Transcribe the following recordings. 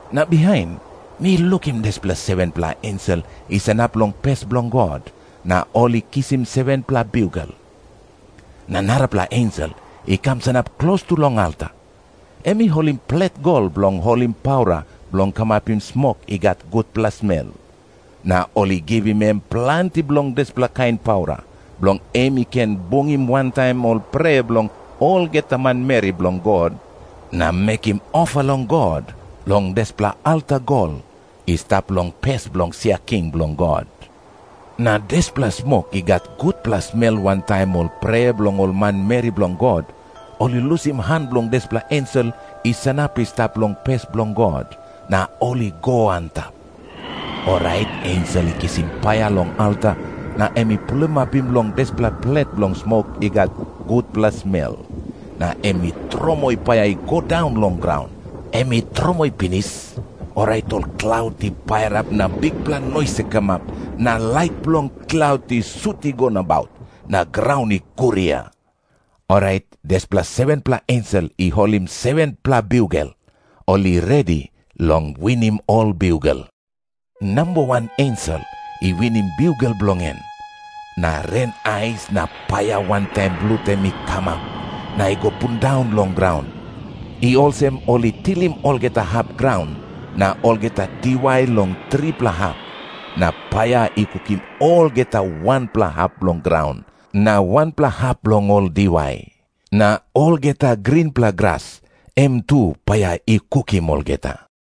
Na bihain mi lukim dispela 7-pela ensel i sanap long pes bilong God, na ol i kisim 7-pela biugel. Na narapela ensel i kam sanap klostu long alta. Em i holim plet gol bilong holim paura bilong kamapim smok i gat gutpela smel. Na ol i givim em planti bilong dispela kain paura, bilong em i ken bungim wantaim ol prea bilong olgeta manmeri bilong God, na mekim ofa long God long dispela alta gol i stap long pes bilong sia king bilong God. Na dispela smok i gat gutpela smel wantaim ol prea bilong ol manmeri bilong God, ol i lusim han bilong dispela ensel i sanap i stap long pes bilong God, na ol i go antap. Orait ensel i kisim paia long alta na em i pulimapim long dispela plet bilong smok i gat gutpela smel, na em i tromoi paia i go daun long graun. Em i tromoi pinis, orait ol klaut i pairap na bikpela nois i kamap, na lait bilong klaut i sut i go nabaut, na graun i guria. Orait dispela 7-pela ensel i holim 7-pela biugel, ol i redi long winim ol biugel. Namba wan ensel i winim biugel bilong en, na ren ais na paia wantaim blut em i kamap, na i go pundaun long graun. I olsem ol i tilim olgeta hap graun na olgeta diwai long tripela hap, na paia i kukim olgeta wanpela hap bilong graun na wanpela hap bilong ol diwai. Na olgeta grinpela gras, em tu paia i kukim olgeta.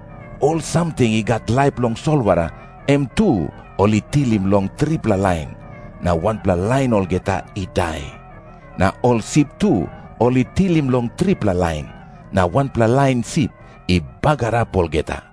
Ol samting i gat laip long solwara, em tu ol i tilim long tripela lain, na wanpela lain olgeta i dai. Na ol sip tu ol i tilim long tripela lain, na wanpela lain sip i bagarap olgeta.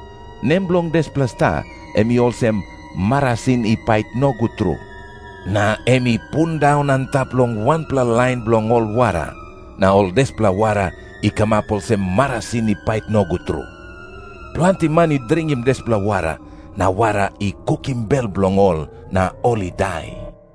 Nem bilong dispela sta em i olsem, Marasin I Pait Nogut Tru. Na em i pundaun antap long wanpela lain bilong ol wara, na ol dispela wara i kamap olsem marasin i pait nogut tru. Planti man i dringim dispela wara, na wara i kukim bel bilong ol na ol i dai.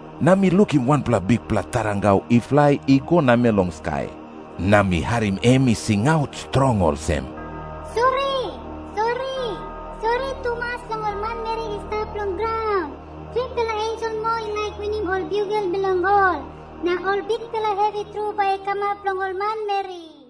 Na mi lukim wanpela bikpela tarangau i flai i go namel long skai. Na mi harim em i singaut strong olsem, "Sori, sori, sori tumas long ol manmeri i stap long graun. Tripela ensel moa i laik winim ol biugel bilong ol, na ol bikpela hevi tru bai i kamap long ol manmeri."